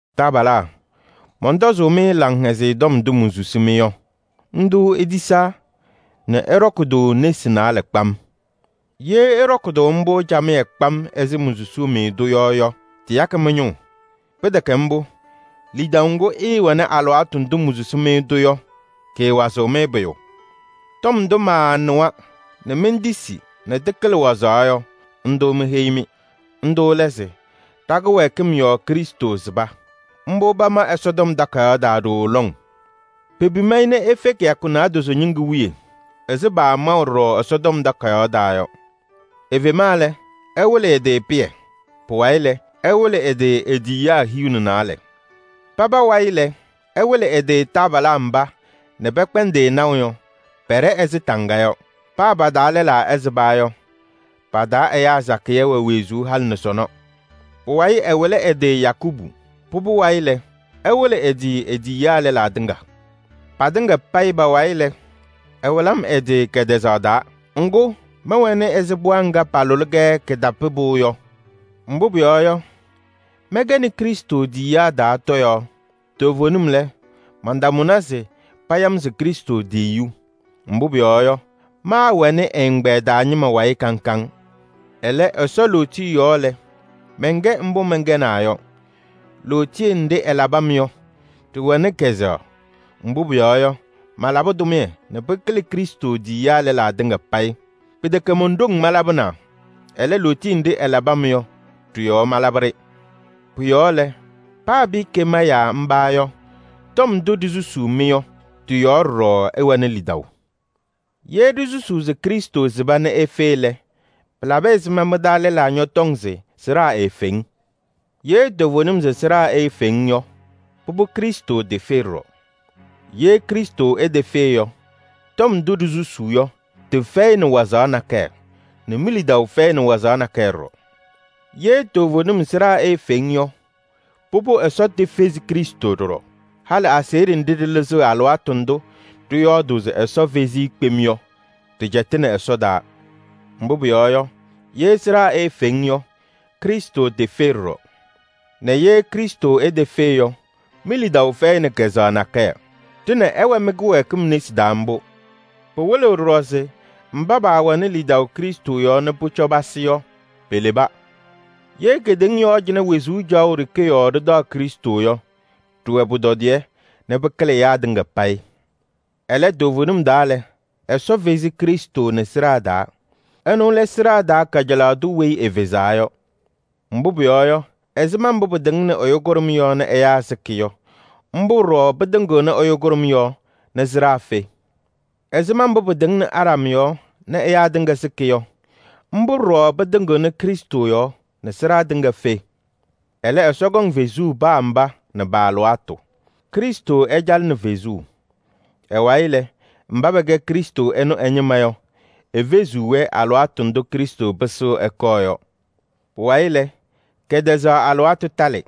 Taabalaa, mɔntɔzʋʋ-mɩ Laŋhɛzɩyɛ Tɔm ndʋ monsusi-mɩ yɔ. Ndʋ itisaa nɛ ɩɖɔkɩ-tʋ nesi naalɛ kpam. Ye ɩɖɔkɩ-tʋ mbʋ camɩyɛ kpam ɛzɩ monsusuu-mɩ-tʋ yɔ yɔ, tɩyakɩ mɩ-ñʋʋ. Pɩtɛkɛ mbʋ, lidaʋ ŋgʋ ɩɩwɛnɩ alɩwaatʋ ndʋ monsusi-mɩ-tʋ yɔ, kɩɩwazɩɣ-mɩ pʋyʋ. Tɔm ndʋ maanɩwa nɛ mentisi nɛ tɩkɩlɩ wazaɣ yɔ, ndʋ meheyi-mɩ. Ndʋ lɛ se: ɖa-kɩwɛɛkɩm yɔɔ Krɩstʋ sɩba. Mbʋ pama Ɛsɔtɔm Takayaɣ taa ɖooo lɔŋ. Pepim-i nɛ efe kɩyakɩŋ naadozo wiye ɛzɩ paamaʋ ɖɔɖɔ Ɛsɔtɔm Takayaɣ taa yɔ. Efema lɛ, ɛwɩlɩ ɛ-tɩ Pɩyɛ. Pʋwayɩ lɛ, ɛwɩlɩ ɛ-tɩ e-tiyiyaa hiu nɛ naalɛ. Paba wayɩ lɛ, ɛwɩlɩ ɛ-tɩ taabalaa mba nɛ pɛkpɛndɩ-ɩ naʋ yɔ, pɛɖɛ ɛzɩ taŋga yɔ. Paa pa-taa lɛlaa ɛsɩba yɔ, pa-taa ɛyaa sakɩyɛ wɛ wezuu halɩ nɛ sɔnɔ. Pʋwayɩ ɛwɩlɩ ɛ-tɩ Yakubu. Pʋbʋ wayɩ lɛ, ɛwɩlɩ ɛ-tɩ e-tiyiyaa lɛlaa tɩŋa. Patɩŋa payɩ pa-wayɩ lɛ, ɛwɩlɩ-m ɛ-tɩ kɛtɛzaɣ taa. Ŋgʋ, mɛwɛnɩ ɛzɩ pɩɣa ŋga palʋlɩ-kɛ kɩtapɩpʋʋ yɔ. Mbʋ pʋyɔɔ yɔ, mɛnkɛnɩ Krɩstʋ tiyiyaa taa tɔyaɣ. Toovenim lɛ, mantamʋna se paya-m se Krɩstʋ tiyiyu. Mbʋ pʋyɔɔ yɔ, maawɛnɩ ɛ-ɛgbɛyɛ taa ñɩma wayɩ kaŋ kaŋ. Ɛlɛ, Ɛsɔ lootiye yɔɔ lɛ, mɛnkɛ mbʋ mɛnkɛnaa yɔ. Lootiye nɖɩ ɛlabɩ-m yɔ, ɖɩwɛnɩ kazʋwa. Mbʋ pʋyɔɔ yɔ, malabɩ tʋmɩyɛ nɛ pɩkɩlɩ Krɩstʋ tiyiyaa lɛlaa tɩŋa payɩ. Pɩtɛkɛ mon-ɖoŋ malabɩnaa, ɛlɛ, lootiye nɖɩ ɛlabɩ-m yɔ ɖɩ-yɔɔ malabɩ-ɖɩ. Pʋ-yɔɔ lɛ, paa pɩɩkɛ ma yaa mba yɔ, tɔm ndʋ ɖisusuu-mɩ yɔ, tɩ-yɔɔ ɖɔɖɔ ɩwɛnɩ lidaʋ. Ye ɖisusuu se Krɩstʋ sɩba nɛ efe lɛ, pɩlabɩ ɛzɩma mɩ-taa lɛlaa ñɔtɔŋ se sɩɖaa eefeŋ? Ye toovenim se sɩɖaa eefeŋ yɔ, pʋbʋ Krɩstʋ tefe ɖɔɖɔ. Ye Krɩstʋ etefe yɔ, tɔm ndʋ ɖisusuu yɔ, tɩfɛyɩnɩ wazaɣ nakɛyɛ nɛ mi-lidaʋ fɛyɩnɩ wazaɣ nakɛyɛ ɖɔɖɔ. Ye toovenim sɩɖaa eefeŋ yɔ, pʋbʋ Ɛsɔ tefezi Krɩstʋ ɖɔɖɔ. Halɩ aseɣɖe nɖɩ ɖɩlɩzɩɣ alɩwaatʋ ndʋ ɖɩyɔɔdʋʋ se Ɛsɔ fezi-i kpem yɔ, ɖɩcɛtɩnɩ Ɛsɔ taa. Mbʋ pʋyɔɔ yɔ, ye sɩɖaa eefeŋ yɔ, Krɩstʋ tefe ɖɔɖɔ. Nɛ ye Krɩstʋ etefe yɔ, mi-lidaʋ fɛyɩnɩ kazʋwa nakɛyɛ. Ɖɩnɛ ɩwɛ mɩ-kɩwɛɛkɩm nesi taa mbʋ. Pɩwɩlɩɣ ɖɔɖɔ se mba paawɛnɩ lidaʋ Krɩstʋ yɔɔ nɛ pʋcɔ pasɩ yɔ, peleba. Ye kedeŋa yɔɔ cɩnɛ wezuu caɣʋ ɖeke yɔɔ ɖɩtaɣ Krɩstʋ yɔ, ɖɩwɛ pʋtɔdɩyɛ nɛ pɩkɩlɩ ɛyaa tɩŋa payɩ. Ɛlɛ toovenim taa lɛ, Ɛsɔ fezi Krɩstʋ nɛ sɩɖaa taa. Ɛnʋ lɛ sɩɖaa taa kajalaɣ tʋ weyi efezaa yɔ. Mbʋ pʋyɔɔ yɔ, ɛzɩma mbʋ pɩtɩŋnɩ ɛyʋ kʋɖʋm yɔɔ nɛ ɛyaa sɩkɩ yɔ, mbʋ ɖɔɖɔ pɩtɩŋɩɣnɩ ɛyʋ kʋɖʋm yɔɔ nɛ sɩɖaa fe. Ɛzɩma mbʋ pɩtɩŋnɩ Aɖam yɔɔ nɛ ɛyaa tɩŋa sɩkɩ yɔ, mbʋ ɖɔɖɔ pɩtɩŋɩɣnɩ Krɩstʋ yɔɔ nɛ sɩɖaa tɩŋa fe. Ɛlɛ, Ɛsɔ kɔŋ fezuu paa mba nɛ pa-alɩwaatʋ: Krɩstʋ ɛcalɩnɩ fezuu. Ɛ-wayɩ lɛ, mba pɛkɛ Krɩstʋ ɛnʋ ɛ-ñɩma yɔ, efeziɣ-wɛ alɩwaatʋ ndʋ Krɩstʋ pɩsɩɣ ɛkɔɔ yɔ. Pʋwayɩ lɛ, kɛtɛzaɣ alɩwaatʋ talɩ: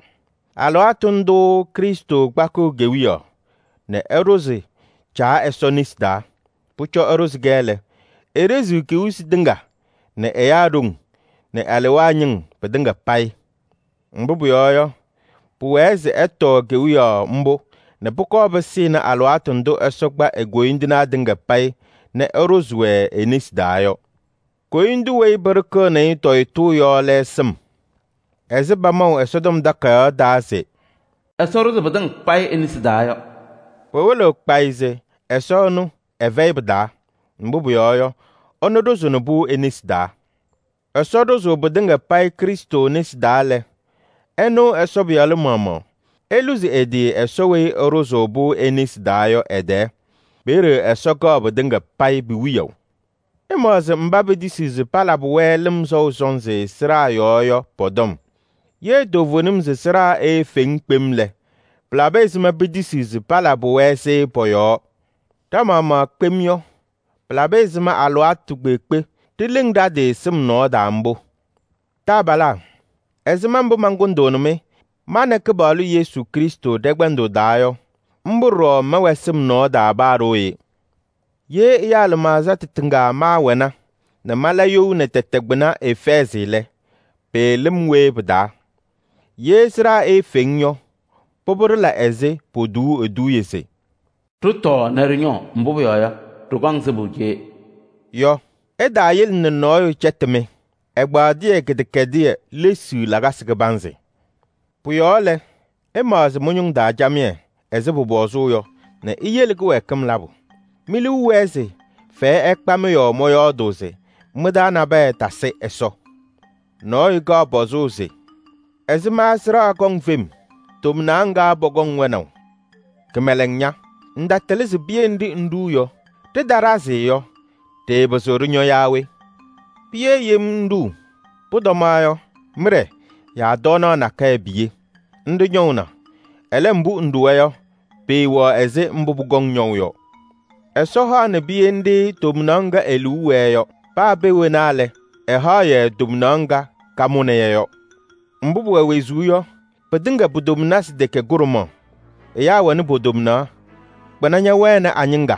alɩwaatʋ ndʋʋ Krɩstʋ kpakɩɣ kewiyaɣ nɛ ɛɖʋzɩ Caa Ɛsɔ nesi taa. Pʋcɔ ɛɖʋzɩ-kɛ lɛ, eɖeziɣ kewiyisi tɩŋa nɛ ɛyaa ɖoŋ nɛ alewaa ñɩŋ pɩtɩŋa payɩ. Mbʋ pʋyɔɔ yɔ, pʋwɛɛ se ɛtɔɔ kewiyaɣ mbʋ nɛ pʋkɔɔ pɩsɩnɩ alɩwaatʋ ndʋ Ɛsɔ kpa e-koyindinaa tɩŋa payɩ nɛ ɛɖʋzɩ-wɛ e-nesi taa yɔ. Koyindu weyi pɩɖɩkɩɣnɩ-ɩ tɔyɩtʋʋ yɔ lɛ sɩm. Ɛzɩ pamaʋ Ɛsɔtɔm Takayaɣ taa se: “Ɛsɔ ɖʋzɩ pɩtɩŋa payɩ e-nesi taa yɔ” pɩwɩlɩɣ kpayɩ se Ɛsɔ ɛnʋ ɛfɛyɩ pɩ-taa. Mbʋ pʋyɔɔ yɔ, ɛnʋ ɖʋzɩnɩ-pʋ e-nesi taa. Ɛsɔ ɖʋzʋʋ pɩtɩŋa payɩ Krɩstʋ nesi taa lɛ, ɛnʋ Ɛsɔ Pɩyalʋ maɣmaɣ eluzi ɛ-tɩ Ɛsɔ weyi ɛɖʋzʋʋ-pʋ e-nesi taa yɔ ɛ-tɛɛ. Peeye Ɛsɔ kɛɣ pɩtɩŋa payɩ pi-wiyaʋ. Ɩmaɣzɩ mba petisiɣ se palabɩ-wɛ lɩm sɔʋ sɔnzɩ sɩɖaa yɔɔ yɔ pɔ-tɔm. Ye toovenim se sɩɖaa eefeŋ kpem lɛ, pɩlabɩ ɛzɩma petisiɣ se palabɩ-wɛ-sɩ pɔ-yɔɔ? Ɖa-maɣmaɣ kpem yɔ, pɩlabɩ ɛzɩma alɩwaatʋ kpeekpe ɖileŋ ɖa-tɩ sɩm nɔɔ taa mbʋ? Taabalaa, ɛzɩma mbʋ mankʋndʋʋnɩ-mɩ ma nɛ Kɩpaɣlʋ Yesu Krɩstʋ ɖɛ-kpɛndʋʋ taa yɔ, mbʋ ɖɔɖɔ mɛwɛ sɩm nɔɔ taa paa ɖooye. Ye ɛyaa lɩmaɣza tɩtɩŋa maawɛna nɛ mala you nɛ tɛtɛ kpɩna Efɛɛzɩ lɛ, pɩɩlɩ-m we pɩ-taa? Ye sɩɖaa eefeŋ yɔ, pʋbʋ ɖɩla ɛzɩ potuuu eduuye se: “Ɖɩtɔɔ nɛ ɖɩñɔɔ, mbʋ pʋyɔɔ yɔ, ɖɩkɔŋ sɩbʋ cee” yɔ. Ɩtaayele nɛ nɔɔyʋ cɛtɩ-mɩ: “Ɛgbaaɖɩyɛ kɩdɛkɛdɩyɛ lesiɣ lakasɩ kɩbanzɩ.” Pʋ-yɔɔ lɛ, ɩmaɣzɩ mɩ-ñʋŋ taa camɩyɛ ɛzɩ pʋpɔzʋʋ yɔ nɛ iyele kɩwɛɛkɩm labʋ. Me-liu wɛɛ se fɛyɛ ɛkpa-mɩ yɔɔ mɔyɔɔdʋʋ se mɩ-taa nabɛyɛ tasɩ Ɛsɔ. Nɔɔyʋ kaɣ pɔzʋʋ se: “Ɛzɩma sɩɖaa kɔŋ fem? Tomnaɣ ŋga pɔkɔŋ wɛnaʋ?” Kɩmɛlɛŋ ña! Ŋtatɩlɩ se piye nɖɩ ŋɖuu yɔ, ɖɩtaɖazɩ yɔ, ɖɩɩpɩzɩɣ ɖɩñɔ yaa we? Piye yem ŋɖuu. Pʋtɔma yɔ, mɩɖɛ yaa tɔɔnaɣ nakɛyɛ piye, nɖɩ ñɔʋna. Ɛlɛ, mbʋ ŋɖuwa yɔ, pɩɩwɛɣ ɛzɩ mbʋ pʋkɔŋ ñɔʋ yɔ. Ɛsɔ haɣnɩ piye nɖɩ tomnaɣ ŋga e-liu wɛɛ yɔ. Paa pee wena lɛ, ɛhaɣ-yɛ tomnaɣ ŋga kamʋnɩ-yɛ yɔ. Mbʋ pʋwɛ wezuu yɔ, pɩtɩŋa pu-tomnasɩ tɛkɛ kʋɖʋmaɣ: ɛyaa wɛnɩ po-tomnaɣ, kpɩna ñɛwɛnɩ a-ñɩŋga,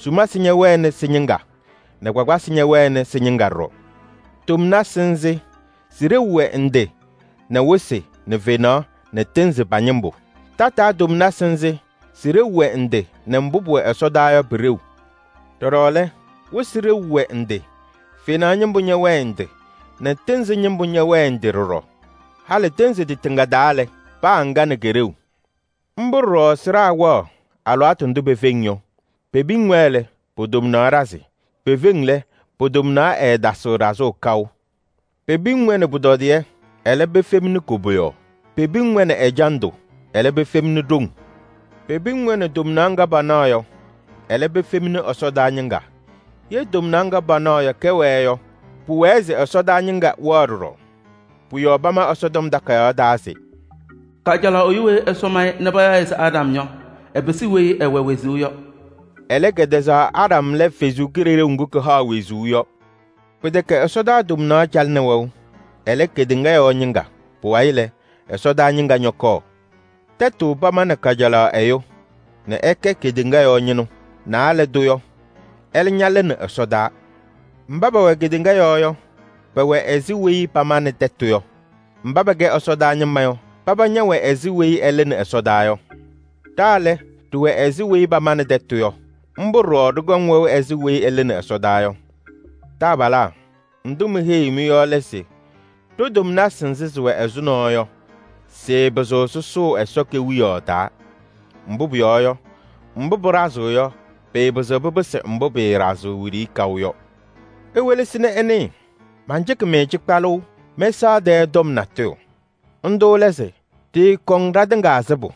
sumasɩ ñɛwɛnɩ sɩ-ñɩŋga nɛ kpakpasɩ ñɛwɛnɩ sɩ-ñɩŋga ɖɔɖɔ. Tomnasɩ nzɩ sɩ-kɔjɔka wɛ ndɩ nɛ wɩsɩ nɛ fenaɣ nɛ tɩɩnzɩ pa-ñɩŋga. Tataa tomnasɩ nzɩ sɩ-kɔjɔka wɛ ndɩ nɛ mbʋ pʋwɛ ɛsɔdaa yɔ pʋ-kɔjɔka. Ɖɔɖɔ lɛ, wɩsɩ kɔjɔka wɛ ndɩ, fenaɣ ñɩŋga ñɛwɛɛ ndɩ nɛ tɩɩnzɩ ñɩŋga ñɛwɛɛ ndɩ ɖɔɖɔ. Halɩ tɩɩnzɩ tɩtɩŋa kɔjɔka wɛ ndɩ nɛ ɖama. Mbʋ ɖɔɖɔ sɩɖaa wɛɣ alɩwaatʋ ndʋ pefeŋ yɔ. Pepiŋ-wɛ lɛ, po-tomnaɣ ɖazɩ, pefeŋ lɛ, po-tomnaɣ ɛɛtasɩɣ ɖazʋʋ kaʋ. Pepiŋ-wɛ nɛ pʋtɔdɩyɛ, ɛlɛ pefemni koboyaɣ. Pepiŋ-wɛ nɛ ɛjandʋ, ɛlɛ pefemni ɖoŋ. Pepiŋ-wɛ nɛ tomnaɣ ŋga panaɣ yɔ, ɛlɛ pefemni ɛsɔdaa ñɩŋga. Ye tomnaɣ ŋga panaɣ yɔ kɛwɛɛ yɔ, pʋwɛɛ se ɛsɔdaa ñɩŋga wɛɣ ɖɔɖɔ. Pʋ-yɔɔ pama Ɛsɔtɔm Takayaɣ taa se: “Kajalaɣ ɛyʋ weyi Ɛsɔ ma-ɩ nɛ payaɣ-ɩ se Aɖam yɔ, ɛpɩsɩ weyi ɛwɛ wezuu yɔ.” Ɛlɛ, kɛtɛzaɣ Aɖam lɛ Kalɩzaɣ ŋga kahaɣ wezuu yɔ. Pɩtɛkɛ ɛsɔdaa tomnaɣ calɩnɩ wɛʋ, ɛlɛ, kedeŋa yɔɔ ñɩŋga. Pʋwayɩ lɛ, ɛsɔdaa ñɩŋga ñɔkɔɔ. Tɛtʋ pamanɩ kajalaɣ ɛyʋ nɛ ɛkɛ kedeŋa yɔɔ ñɩnʋ. Naalɛ tʋ yɔ, ɛlɛ ñalɩnɩ ɛsɔdaa. Mba pɛwɛ kedeŋa yɔɔ yɔ, pɛwɛ ɛzɩ weyi pamanɩ tɛtʋ yɔ. Mba pɛkɛ ɛsɔdaa ñɩma yɔ, paba ñɛwɛ ɛzɩ weyi ɛlɩnɩ ɛsɔdaa yɔ. Ɖa lɛ, ɖɩwɛ ɛzɩ weyi pamanɩ tɛtʋ yɔ. Mbʋ ɖɔɖɔ ɖɩkɔŋ wɛʋ ɛzɩ weyi ɛlɩnɩ ɛsɔdaa yɔ. Taabalaa, ndʋ meheyiɣ-mɩ yɔ lɛ se: ɖo-tomnasɩ nzɩ sɩwɛ ɛzʋnɔ yɔ, sɩɩpɩzɩɣ sʋsʋʋ Ɛsɔ Kewiyaɣ taa. Mbʋ pʋyɔɔ yɔ, mbʋ pɩɖazɩɣ yɔ, pɩɩpɩzɩɣ pɩpɩsɩ mbʋ pɩɩɖazɩɣ wiɖiyi kaʋ yɔ. Iwelesi nɛ ɩnɩɩ: mancɩkɩ-mɩ cɩkpalʋʋ mɛsaɣ tɛɛ tɔm natʋyʋ. Ndʋ lɛ se: ɖɩɩkɔŋ ɖatɩŋa sɩbʋ.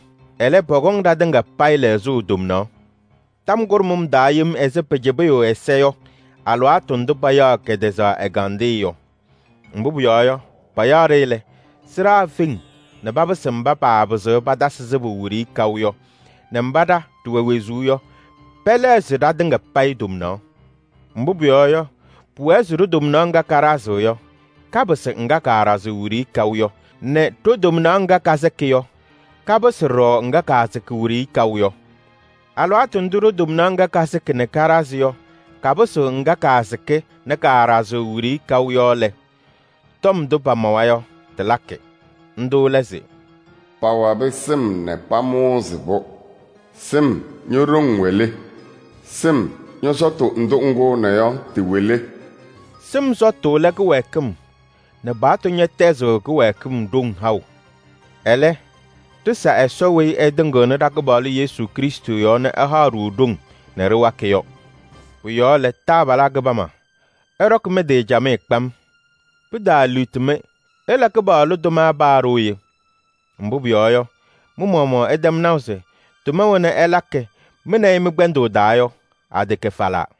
Ɛlɛ, pɔkɔŋ ɖatɩŋa payɩ lɛɣzʋʋ tomnaɣ tɔm kʋɖʋm taa yem ɛzɩ pacɩbɩyʋʋ ɛza yɔ alɩwaatʋ ndʋ payaɣ kɛtɛzaɣ ɛgandɩyɛ yɔ. Mbʋ pʋyɔɔ yɔ, payaɣ-ɖɩ lɛ, sɩɖaa feŋ nɛ papɩsɩ mba paapɩzɩɣ patasɩ sɩbʋ wiɖiyi kaʋ yɔ nɛ mba ɖa ɖɩwɛ wezuu yɔ, pɛlɛɣzɩ ɖatɩŋa payɩ ɖo-tomnaɣ. Mbʋ pʋyɔɔ yɔ, pʋwɛɛ se ɖo-tomnaɣ ŋga kaɖazɩɣ yɔ, kapɩsɩ ŋga kaaɖazɩɣ wiɖiyi kaʋ yɔ nɛ ɖo-tomnaɣ ŋga kasɩkɩ yɔ, kapɩsɩ ɖɔɖɔ ŋga kaasɩkɩ wiɖiyi kaʋ yɔ. Alɩwaatʋ ndʋ ɖo-tomnaɣ ŋga kasɩkɩ nɛ kaɖazɩ yɔ kapɩsɩɣ ŋga kaasɩkɩ nɛ kaaɖazɩɣ wiɖiyi kaʋ yɔ lɛ, tɔm ndʋ pamawa yɔ tɩlakɩ. Ndʋ lɛ se: “Pawabɩ sɩm nɛ pamʋʋzɩ-pʋ. Sɩm, ño-ɖoŋ wɛ le? Sɩm, ñɔ-sɔtʋ ndʋ ŋkʋʋna yɔ tɩwɛ le?” Sɩm sɔtʋ lɛ kɩwɛɛkɩm nɛ Mooyiizi paɣtʋ ñahaɣ kɩwɛɛkɩm ɖoŋ. Ɛlɛ, ɖɩsa Ɛsɔ weyi ɛtɩŋɩɣnɩ ɖa-Kɩpaɣlʋ Yesu Krɩstʋ yɔɔ nɛ ɛhaɣ-ɖʋ ɖoŋ nɛ ɖɩwakɩ yɔ. Pʋ-yɔɔ lɛ, taabalaa kɩbama, ɩɖɔkɩ mɩ-tɩ camɩyɛ kpam. Pɩtaaliɣti-mɩ, ɩla Kɩpaɣlʋ tʋma paa ɖooye. Mbʋ pʋyɔɔ yɔ, mɩ-maɣmaɣ ɩtɛm naʋ se tʋma wena ɩlakɩ mɩ nɛ ɩ mɩ-kpɛndʋʋ taa yɔ, atɛkɛ falaa.